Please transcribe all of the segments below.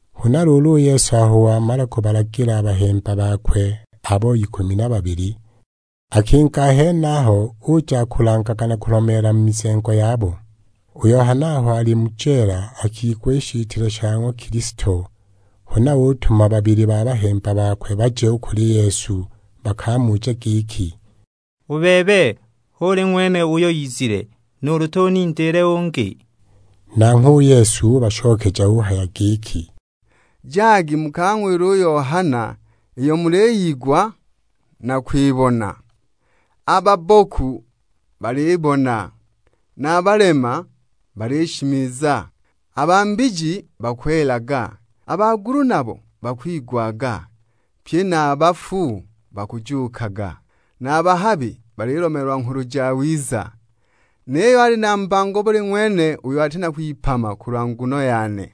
Huna luulu u Yesu aho wamala kubalagila a bahemba bakwe abo ikumi na babili, akinga a henaho uja akulangaga na kulomeela mu mizengo yabo. U Yohana aho ali mu jeela akigwa i shitile sha ng'wa Kilisto; huna utuma babili ba bahemba bakwe baje u kuli Yesu bakamuje giki, "U bebe hu uli ng'wene uyo izile, nuulu tunindiile ungi?" Nanghwe u Yesu ubashokeja uhaya giki, "Jagi mukang'wile u Yohana iyo muliyigwa na kwibona. A babboku balibona, na a balema balishimiza, a ba mbiji bakwelaga, a bagulu nabo bakwigwaga; pye na a bafu bakujuukaga, na a bahabi balilomeelwa Nghulu Jawiza. Niyo ali na mbango buli ng'wene uyo ati na kwipama kulwa nguno yane."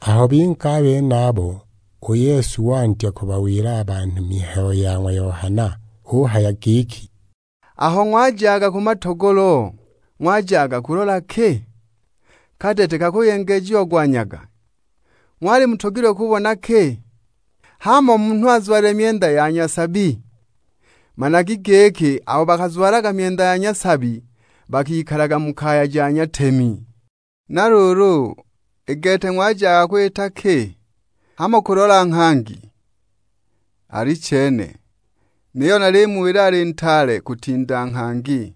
Aho binga a benabo, u Yesu wandya kubawila a banhu mihayo ya ng'wa Yohana. Uhaya giki, "Aho ng'wajaga ku matogolo, ng'wajaga kulola ki? Kadete kakuyengejiagwa nyaga? Ng'wali mutogilwe kubona ki? Hamo munhu azwalilile myenda ya nyasabi? Managi giki abo bakazwalaga myenda ya nyasabi bakikalaga mu kaya ja nyatemi. Na luulu, i gete ng'wajaga kwita ki? Hamo kulola nghangi? Alichene, niyo nalimuwila ali ntaale kutinda nghangi!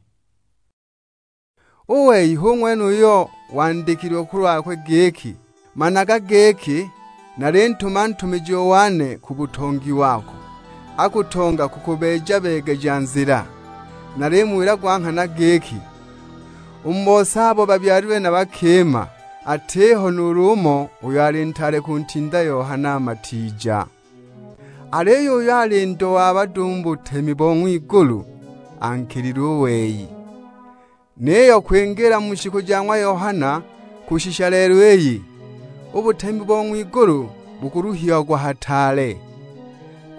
U wei hu ng'wene uyo gwandikilwe kulwakwe giki, 'Managa giki, nalintuma ntumijiwa wane ku butongi wako, akutonga kukubeeja-beegeja nzila.' Nalimuwila gwa nghana giki, u mu bose abo babyalilwe na bakima, atiho nuulu umo uyo ali ntaale kuntinda Yohana Matiija. Aliyo uyo ali ndo wa bado u mu butemi bo ng'wigulu ankilile u wei. Niyo kwingiila mu shiku ja ng'wa Yohana kushisha lelo iyi, u butemi bo ng'wigulu bukuluhiagwa hataale,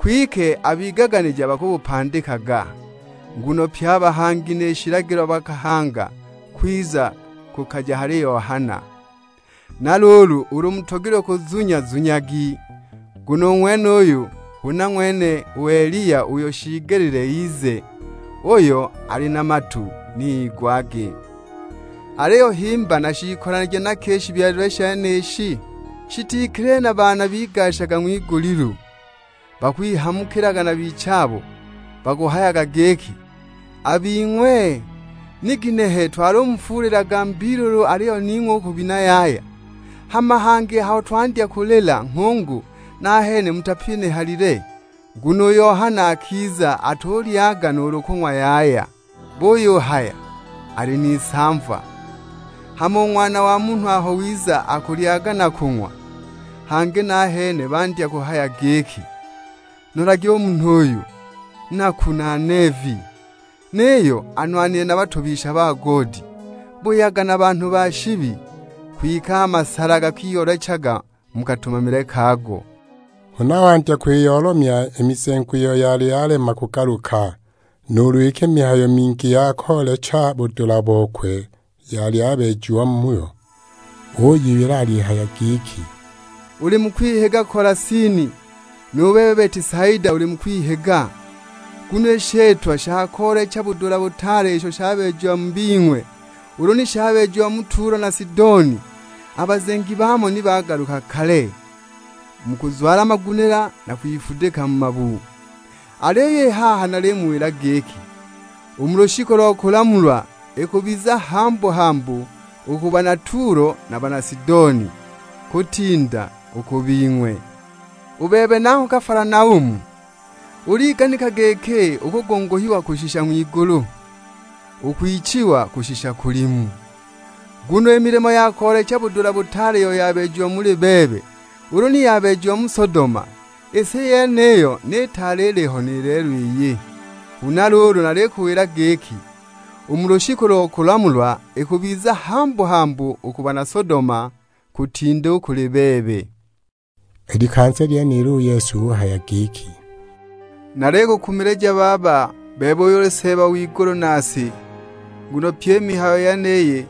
kwike a bigaganija bakubupandikaga. Nguno pye a bahangi ni shilagilo bakahanga kwiza kukaja hali Yohana. Na luulu ulu mutogilwe kuzunya zunyagi, nguno u ng'wenuyu huna ng'wene u Eliya uyo shiigelile ize. Uyo ali na matu ni igwage. "Aliyo himba nashiikolanije na ki i shibyalilwe shenishi? Shitikilile na baana bigashaga ng'wigulilu bakwihamukilaga na bichabo; bakuhayaga giki, 'A bing'we, ni ginehe twalumufuulilaga mbiilulu aliyo ning'we u kubina yaya; hama hangi aho twandya kulila nghungu nahene mutapinihalile!' Nguno u Yohana akiza atulyaga nuulu kung'wa yaya; buyuhaya, 'Ali n'isamva.' Hama u Ng'wana wa Munhu aho wiza akulyaga na kung'wa, hangi nahene bandya kuhaya giki, 'Nolagi u munhu uyu; naku na neevi, niyo anwanile na batobisha ba goodi, buyaga na banhu ba shibi!' Kwike a masala gakiyoolechaga mu katumamile kago." Huna wandya kwiyoolomya i mizengo iyo yali yalema kugaluka, nuulu iki mihayo mingi ya koolecha budula bokwe yali yabeejiwa muyo. Uyiwila alihaya giki, "Uli mu kwihiga Kolasini, nu bebe Betisaida uli mu kwihiga. Nguno i shitwa sha koolecha budula butaale isho shabeejiwe mu bing'we ulu ni shabeejiwa mu Tulo na Sidoni, a bazengi baamo ni bagaluka kale, mu kuzwala magunila na kwifudika mu mabu. Aliyo i haha nalimuwila giki, u mu lushiku lo kulamulwa, ikubiza hambu-hambu u ku bana Tulo na a bana Sidoni, kutinda u ku bing'we! U bebe nangho Kafalanaumu, uliganika giki ukugunguhiwa kushisha ng'wigulu? Ukwichiwa kushisha kulimu! Nguno i milimo ya koolecha budula butaale iyo yabeejiwe muli bebe ulu ni yabeejiwa mu Sodoma, i si yeniyo ni itaali iliho ni lelo iyi! Huna luulu nalikuwila giki, u mu lushiku lo kulamulwa, ikubiza hambu-hambu u ku bana Sodoma kutinda u kuli bebe." I likanza lyenilo u Yesu uhaya giki, "Nalikukumilija Baba, bebe uyo uli Seeba w'igulu na si; nguno pyi i mihayo yeniyi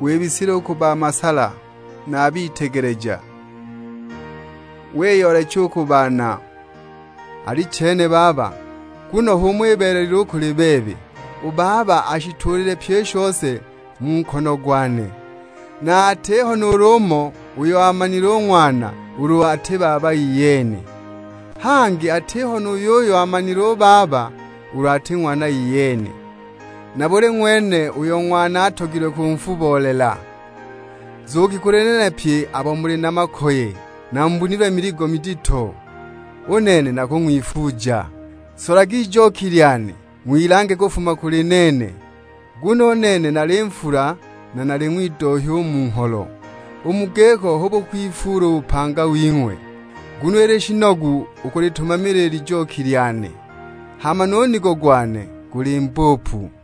wibisile u ku ba masala na a bitegeleja, wiyoolecha u ku baana. Alichene Baba, nguno h'umo ibeelelile u kuli bebe. U Baba ashituulile pyi i shose mu nkono gwane; na atiho nuulu umo uyo aamanile u Ng'wana ulu ati Baba iyene. Hangi atiho nu yuyo aamanile u Baba, ulu ati Ng'wana iyene, na buli ng'wene uyo Ng'wana alatogwe kunfubolela. Nzugi kuli nene pye abo muli na makoye, na mubunilwe miligo midito; u nene nakung'wifuuja. Solagi ijoki lyane, ng'wilange kufuma kuli nene, nguno u nene nali nfula na nali ng'widohya u mu ngholo; u mu giko hu bukwifuula u bupanga wing'we. Nguno ili shinogu u kulitumamila i lijoki lyane; hama nu nigo gwane guli mbupu."